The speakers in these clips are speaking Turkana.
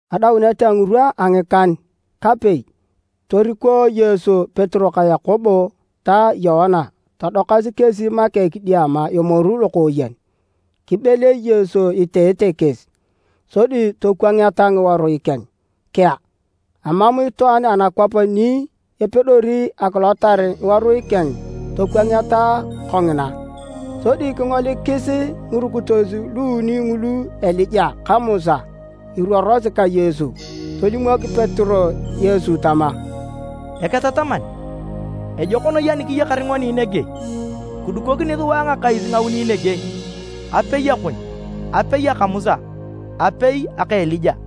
Adaunet a ngirwa a ngikan-kapei, toriko Yesu Petero ka Yakobo ta Yoana todokasi kesi make kidiama emoru lokooyen. Kibelei Yesu iteete kesi, sodi tokwangeta ngiworui keng kea, emam itwaan anakwap ni epedori akilotar ngiworui keng tokwangeta kongina. Sodi kingolikis ngirukitos luuni ngulu Elija ka Musa iruorosi ka Yesu. Tolimok Petero Yesu tama, “Eketataman, ejok noi ani kiyakar ngoni nege! Kidukokini sua ngakais ngauni nege, apei akon, apei aka Musa, apei aka Elija.”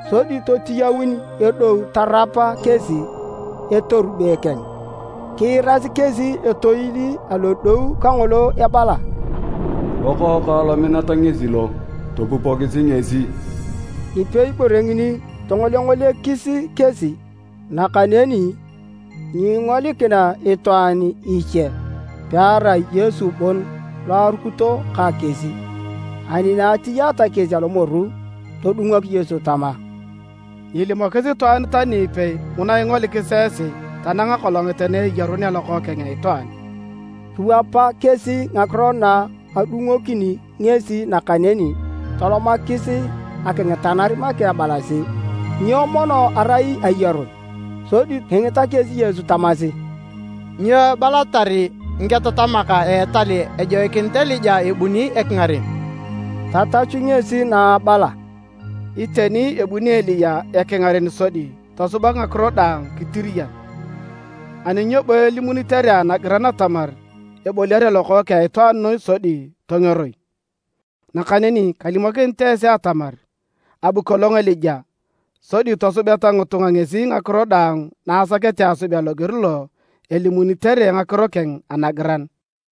Sodi totiyaun edou tarap kesi a etorube keng, kiirasi kesi etoil alodou kangolo ebala, “Lokookang lominat ngesi lo, topupokisi ngesi!” Nipei bore ngini tongolengolekis kesi, nakaneni nyingolikina itwaan iche pearai Yesu bon lo arukito ka kesi. Ani etiyaate kesi alomoru todungok Yesu tama, “Nyiilimokis itwaan tani ipei nguna ingolikis esi tanang akolongit na eyarunea Lokookeng a Itwaan.” Kiwapa kesi ngakiro na adungokini ngesi, nakaneni tolomakis akingitanar make ebalasi, “Nyo, mono erai ‘ayarun’?” Sodi kingita kesi Yesu tamasi, “Nyo ebalatar ngiketatamak a etal ejoikinit Elija ebuni ekingaren?” Tatachu ngesi na abala, “Iteni ebuni Elija ekingaren sodi tosubak ngakiro daang kitiriyan. Ani nyo bo elimunitere anagiran atamar eboliare Lokookeng a Itwaan noi sodi tongeroi? Nakaneni kalimokinit esi atamar abu kolong Elija sodi tosubeta ngitunga ngesi ngakiro daang na asakete asubea loger lo elimunitere ngakiro keng anagiran.”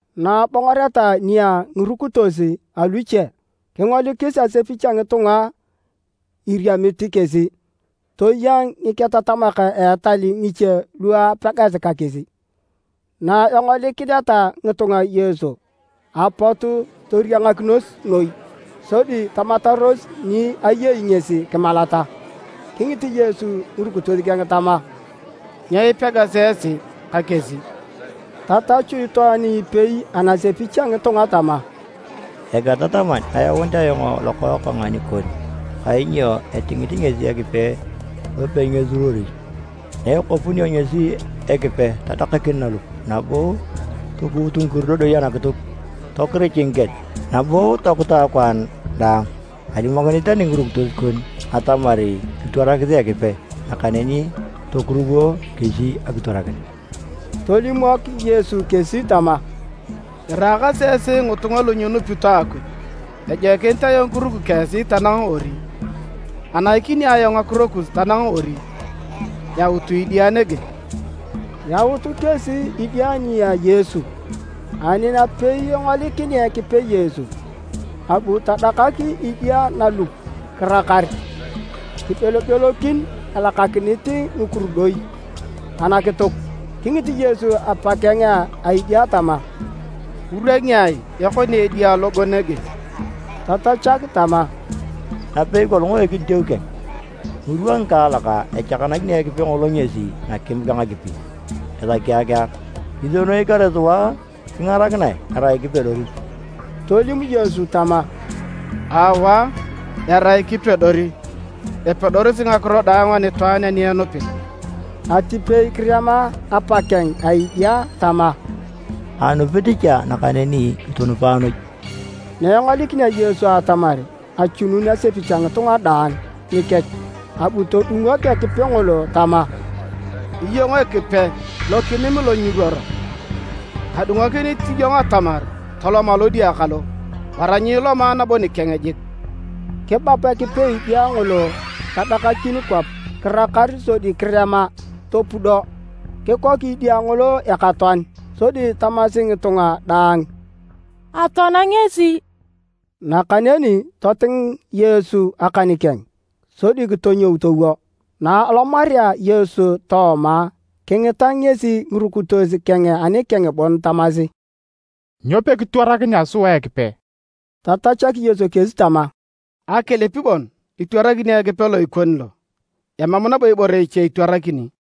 Na abongoreta nia ngirukitos aluche, kingolikis asepich a ngitunga iriamit kesi toya ngiketatamak a etal ngiche lu apegasi ka kesi. Na engolikineta ngitunga Yesu, apot toriangakinos noi, sodi tamataros ni ayei ngesi kimalata. Kingit Yesu ngirukitos keng tama, “Nyo ipegasi esi ka kesi?” Tatachu itwaan ipei anasepich a ngitunga tama, “Eketataman, ayaunit ayong lokookang nikon kainyo etingit ngesi Ekipe lopenyisuruori. Na ekopunio ngesi Ekipe tadakakin nalup, nabo tokuut ngikurudoi anakituk, tokirich ngikel, nabo tokuta akwaan daang. Alimokinit tani ngirukitos kon atamar kitwarakisi Ekipe, nakaneni tokuruwo kesi akitwarakin.” Tolimok Yesu kesi tama, “Iraakasi esi ngitunga lu nyinupito Akuj! Ejoikinit ayong kiruki ka esi tanang ori? Anaikini ayong ngakiro kus tanang ori? Yautu idia nege!” Yaut kesi idia nia Yesu. Ani napei engolikinea Ekipe Yesu, abu tadakak idia nalup kirakar, kibelobelokin elakakinit ngikurudoi anakituk. Kingit Yesu apakeng a idia tama, “Ngirwa ngiai ekonea edia logo nege?” Tatachak tama, “Napei kolong a ekiditeu keng. Ngirwa ngikaalak echakanakini Ekipe ngolo ngesi nakim ka nakipi esaki akiar. Kisienoi kare sua kingarakinae, erai kipedori!” Tolim Yesu tama, “Aawa, erai kipedori! Epedorosi ngakiro daang anitwaan ani enupit.” Atipei kirema apakeng a edia tama, “Anupit cha nakaneni kitunupae noi!” Na engolikinea Yesu atamar achunun asepich a ngitunga daang nikech, abu todungok Ekipe ngolo tama, “Iyong Ekipe lokinim lo nyiruoro, kadungokinit iyong atamar tolom alodia kalo, wara nyiiloma nabo nikeng jik!” Kibap Ekipe edia ngolo tadakakin kwap kirakar sodi kirema, topudo. Kikok edia ngolo ekatoan, sodi tamasi ngitunga daang, “Atoana ngesi!” Nakaneni toting Yesu akan keng sodi kitonyou towo. Na alomarea Yesu tooma, kingita ngesi ngirukitos keng anikeng bon tamasi, “Nyo pekitwarakinea sua Ekipe?” Tatachak Yesu kesi tama, “Akilip bon itwarakini Ekipe lo ikoni lo, emam nabo ibore iche itwarakini.”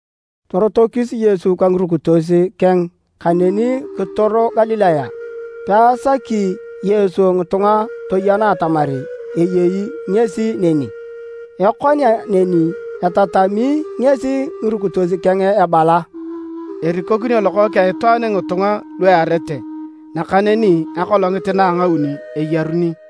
Torotokis Yesu ka ngirukitos keng kaneni kitoro Galilaya, peasaki Yesu ngitunga toyena atamar ayei ngesi neni. Ekonea neni, etatami ngesi ngirukitos keng ebala, “Erikokinio Lokookeng a Itwaan ngitunga lu earete nakaneni akolongit na a ngauni eyaruni.”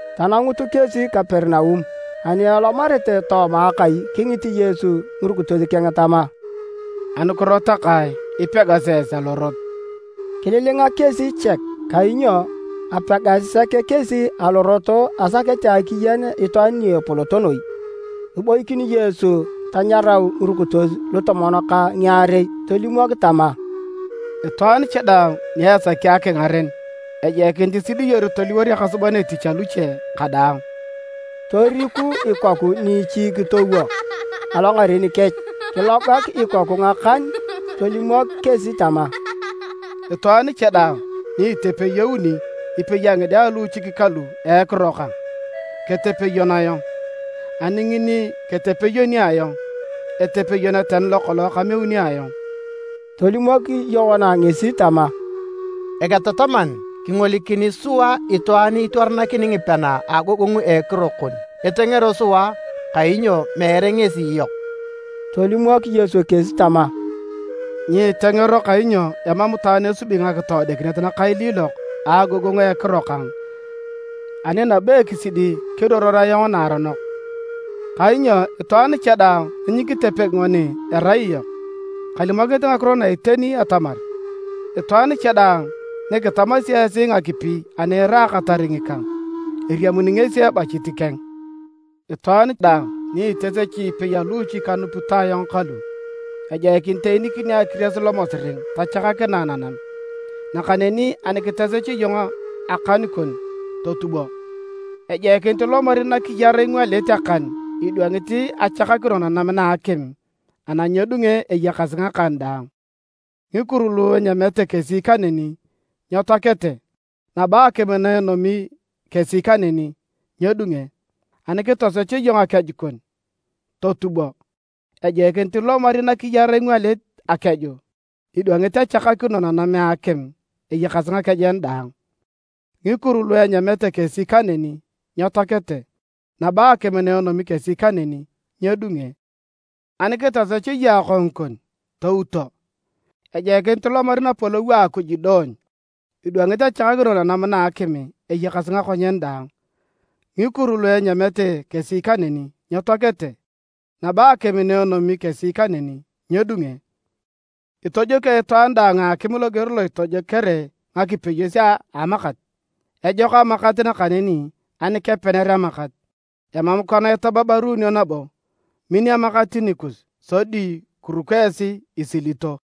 Tanangut kesi Kaperinaum, ani elomarete tooma kai, kingit Yesu ngirukitos keng tama, “Anukiro takae ipegasi esi alorot?” Kililinga kesi chek kainyo apegasi sek kesi alorot asakete akiyen itwaan ni epolot noi. Kiboikin Yesu tanyarau ngirukitos lutomon ka ngiarei tolimok tama, “Itwaan cha daang ni esaki akingaren, ejoikinit isidiyor toliwor ekasuban etich aluche kadaang.” Toriku ikoku niichi kitowo alongaren kech, kilogak ikoku ngakan tolimok kesi tama, “Itwaan cha daang ni itepeyoni ipei a ngide a luuchik kalu a ekiro kang, ketepeyon ayong, ani ngini ketepeyoni ayong, etepeyon tani lokolong kameuni ayong.” Tolimok Yoana ngesi tama, “Eketataman, kingolikini sua itwaan itwarakini ngipean a agogongu a ekiro kon etengero sua kainyo meere ngesi iyok.” Tolimok Yesu kesi tama, “Nyiitengero kainyo emam itwaan esubi ngakitoodikinet nakailiilok a agogongu a ekiro kang ani nabo ekisidi keruoror ayong naaronok. Kainyo itwaan cha daang ni nyikitepegi ngoni erai iyok. Kalimokinit ngakiro na iteni atamar, itwaan cha daang ni kitamasi esi ngakipi ani iraakatar ngikang, eriamuni ngesi ebachit keng. “Itwaan daang ni itosechi ipei a luuchik kanupito ayong kalu, ejoikinit eenikinio akiries lomosiring tachakakinae nanam. Nakaneni ani kitosech iyong akan kon totubo! Ejoikinit ilomari nakiyar ingwalit akan idwangit achakakino nanam na akim ana nyedunge eyakasi ngakan daang. [ Ngikuru lu enyamete kesi kaneni nyetoakete, nabo akim na enomi kesi kaneni, nyedunge.] Ani kitosech iyong akeju kon, totubo! Ejoikinit ilomari nakiyar ingwalit akeju idwangit achakakino nanam a akim eyakasi ngakejen daang. [ Ngikuru lu enyamete kesi kaneni, nyetoakete, nabo akim na enomi kesi kaneni, nyedunge.] Ani kitosech iyong akongu kon, touto! Ejoikinit ilomari napolou a Akuj idoony, idwangit achakakino nanam na a akim eyakasi ngakonyen daang. Ngikuru lu enyamete kesi kaneni, nyetoakete, nabo akim na enomi kesi kaneni, nyedunge. “Itojokio itwaan daang a akim loger lo itojokere ngakipeyos a amakat.” “Ejok amakat, nakaneni ani kepener amakat, emam kona itababaruunio nabo.” “Min amakat nikus, sodi kiruko esi isilito.”